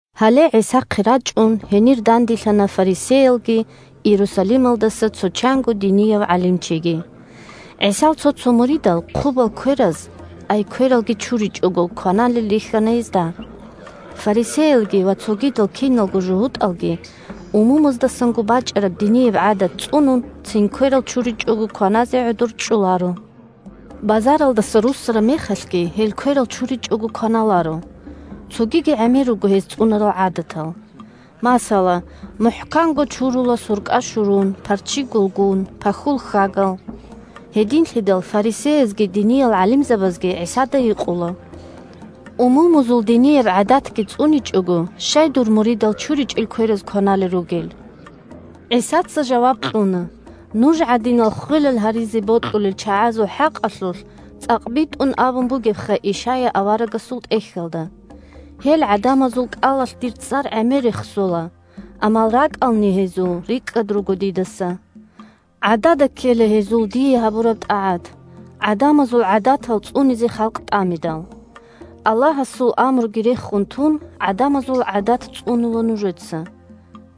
Гьале ГӀисахъе рачӀун, гьенир данделъана фарисеялги Иерусалималдаса цо чанго динияв гӀалимчиги. ГӀисал цо-цо муридал «хъубал» квераз, ай квералги чуричӀого, кваналел рихьана гьезда. ( Фарисеялги ва цогидал киналго жугьутӀалги, умумуздасанго бачӀараб динияб гӀадат цӀунун, цин кверал чуричӀого кваназе гӀодор чӀоларо. Базаралдаса руссараб мехалъги гьел кверал чуричӀого кваналаро. Цогиги гӀемер руго гьез цӀунарал гӀадатал. Масала, мухӀканго чурула суркӀа-щурун, парччи-гулгун, пахьул хьагал.) Гьединлъидал фарисеязги диниял гӀалимзабазги ГӀисада гьикъула: – Умумузул динияб гӀадатги цӀуничӀого щай дур муридал чуричӀел квераз кваналел ругел? ГӀисаца жаваб кьуна: – Нуж гӀадинал ххвелал гьаризе бокьулел чагӀазул хӀакъалъулъ цӀакъ битӀун абун бугебха Ишая аварагасул тӀехьалда: «Гьел гӀадамазул кӀалалъ Дир цӀар гӀемер рехсола, Амма ракӀални гьезул рикӀкӀад руго Дидаса. ГӀадада ккела гьезул Дие гьабураб тӀагӀат, ГӀадамазул гӀадатал цӀунизе халкъ тӀамидал». Аллагьасул амруги рехун тун, гӀадамазул гӀадат цӀунула нужеца.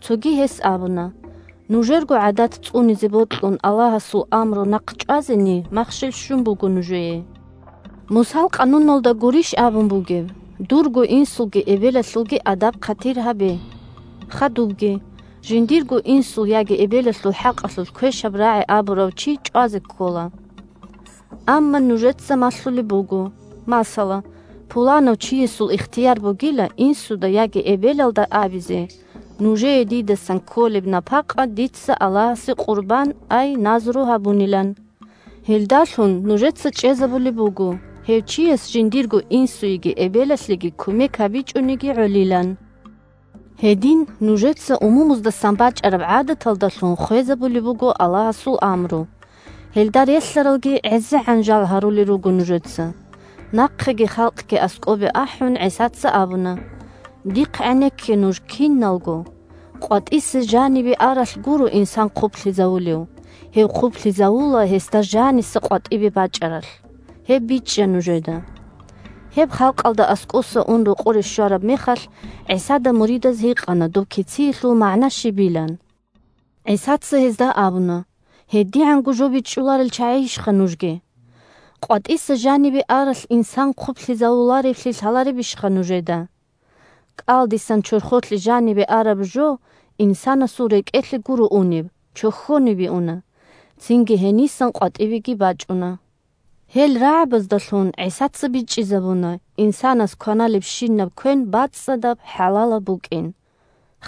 Цоги гьес абуна: – Нужерго гӀадат цӀунизе бокьун Аллагьасул амру нахъчӀвазени махщел щун буго нужее! Мусал къануналда гурищ абун бугеб: «Дурго инсулги эбелалъулги адаб-хъатир гьабе!» Хадубги: «Жиндирго инсул яги эбелалъул хӀакъалъулъ квешаб рагӀи абурав чи чӀвазе ккола». Амма нужеца малъулеб буго: масала, пуланав чиясул ихтияр бугила инсуда яги эбелалда абизе нужее дидасан кколеб напакъа дица Аллагьасе къурбан, ай назру гьабунилан. Гьелдалъун нужеца чӀезабулеб буго гьев чияс жиндирго инсуеги эбелалъеги кумек гьабичӀониги гӀолилан. Гьедин нужеца умумуздасан бачӀараб гӀадаталдалъун хвезабулеб буго Аллагьасул амру. Гьелда релълъаралги гӀезегӀан жал гьарулел руго нужеца. Инсан сунца хъублъизавулев? Нахъеги халкъги аскӀобе ахӀун, ГӀисаца абуна: – Дихъ гӀенекке нуж киналго: къватӀиса жанибе аралъ гуро инсан хъублъизавулев, гьев хъублъизавула гьесда жаниса къватӀибе бачӀаралъ. Гьеб бичӀчӀа нужеда! Гьеб халкъалда аскӀоса ун рокъоре щвараб мехалъ ГӀисада муридаз гьикъана доб кициялъул магӀна щибилан. ГӀисаца гьезда абуна: – ГьедигӀанго жо бичӀчӀуларел чагӀийищха нужги? КъватӀиса жанибе аралъ инсан хъублъизавуларевлъи лъаларебищха нужеда? КӀалдисан чорхолъе жанибе араб жо инсанасул рекӀелъе гуро унеб, чохьонибе уна, цинги гьенисан къватӀибеги уна. (Гьел рагӀабаздалъун ГӀисаца бичӀчӀизабуна инсанас кваналебщинаб квен бацӀцӀадаб, хӀалалаб букӀин.)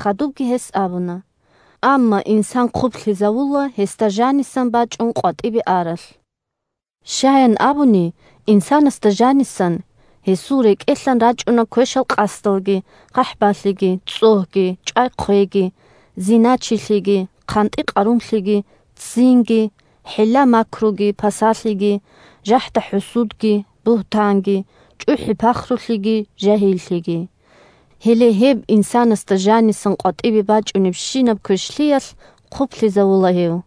Хадубги гьес абуна: – Амма инсан хъублъизавула гьесда жанисан бачӀун къватӀибе аралъ. Щаян абуни, инсанасда жанисан, гьесул рекӀелъан рачӀуна квешал къасдалги, хъахӀбалъиги, цӀогьги, чӀвай-хъвейги, зиначилъиги, хъантӀи-къарумлъиги, ццинги, хӀилла-макруги, пасалъиги, жахӀда-хӀусудги, бугьтанги, чӀухӀи-пахрулъиги, жагьиллъиги. Гьеле гьеб инсанасда жанисан къватӀибе бачӀунебщинаб квешлъиялъ хъублъизавула гьев.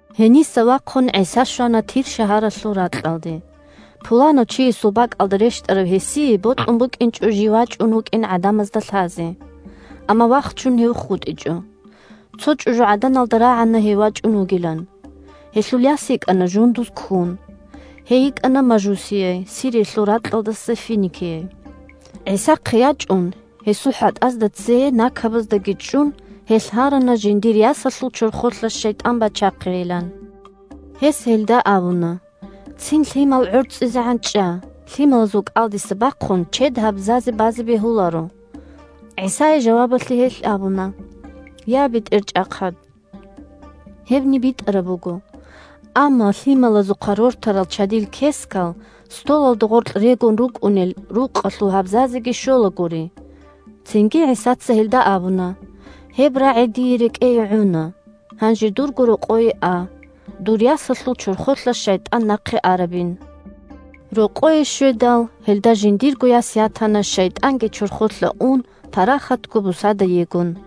Гьениса вахъун ГӀиса щвана Тир шагьаралъул ракьалде. Пуланав чиясул бакӀалда рещтӀарав гьесие бокьун букӀинчӀо жив вачӀун вукӀин гӀадамазда лъазе. Амма вахчун гьев хутӀичӀо. Цо чӀужугӀаданалда рагӀана гьев вачӀун вугилан. Гьелъул яс йикӀана жундуз ккун. (Гьей йикӀана мажусияй, Сириялъул ракьалдаса финикияй.) ГӀисахъе ячӀун, гьесул хӀатӀазда цее накабаздаги чӀун, гьелъ гьарана жиндир ясалъул чорхолъа шайтӀан бачахъейилан. Гьес гьелда абуна: – Цин лъимал гӀорцӀизегӀан чӀа, лъималазул кӀалдиса бахъун чед гьабзазе базе бегьуларо. ГӀисае жавабалъе гьелъ абуна: – Я, БетӀерчӀахъад! Гьебни битӀараб буго. Амма лъималазухъа рортарал чадил кескал столалда гъоркь регун рукӀунел рукъалъул гьабзазеги щолагури. Цинги ГӀисаца гьелда абуна: – Гьеб рагӀи дие рекӀее гӀуна, гьанже дурго рокъое а; дур ясалъул чорхолъа шайтӀан нахъе арабин. Рокъое щведал, гьелда жиндирго яс ятана, шайтӀанги чорхолъа ун, парахатго бусада егун.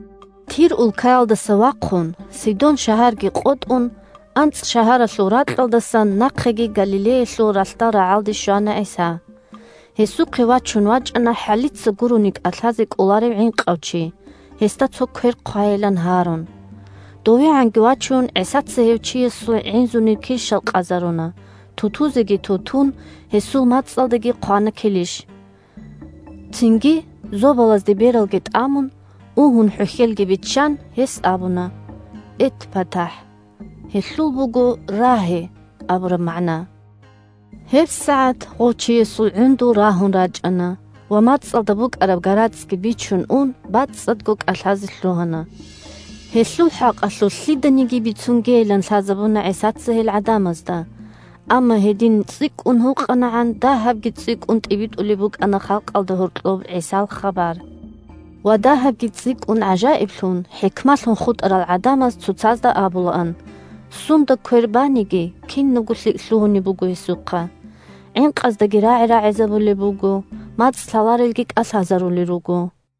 Тир улкаялдаса вахъун, Сидон шагьарги къотӀун, АнцӀшагьаралъул ракьалдасан нахъеги Галилеялъул ралъдал рагӀалде щвана ГӀиса. Гьесухъе вачун вачӀана хӀалица гурони кӀалъазе кӀоларев гӀинкъав чи, гьесда цо квер хъвайилан гьарун. ДовегӀанги вачун, ГӀисаца гьев чиясул гӀинзунир килщал къазаруна, ту-тузеги ту-тун гьесул мацӀалдаги хъвана килищ. Цинги, зобалазде бералги тӀамун, угьун хӀухьелги биччан, гьес абуна: – ЭтпатахӀ! (Гьелъул буго «Рагье!» абураб магӀна.) ГьебсагӀат гъов чиясул гӀундул рагьун рачӀана, ва мацӀалда букӀараб гарацӀги бичун ун, бацӀцӀадго кӀалъазе лъугьана. Гьелъул хӀакъалъулъ лъиданиги бицунгейилан лъазабуна ГӀисаца гьел гӀадамазда. Амма гьедин цӀикӀкӀун гьукъанагӀан, дагьабги цӀикӀкӀун тӀибитӀулеб букӀана халкъалда гьоркьоб ГӀисал хабар. Ва дагьабги цӀикӀкӀун гӀажаиблъун, хӀикмалъун хутӀарал гӀадамаз цоцазда абулаан: – Сунда квер баниги, кинабго лъикӀ лъугьунеб буго гьесухъа. ГӀинкъаздаги рагӀи рагӀизабулеб буго, мацӀ лъаларелги кӀалъазарулел руго.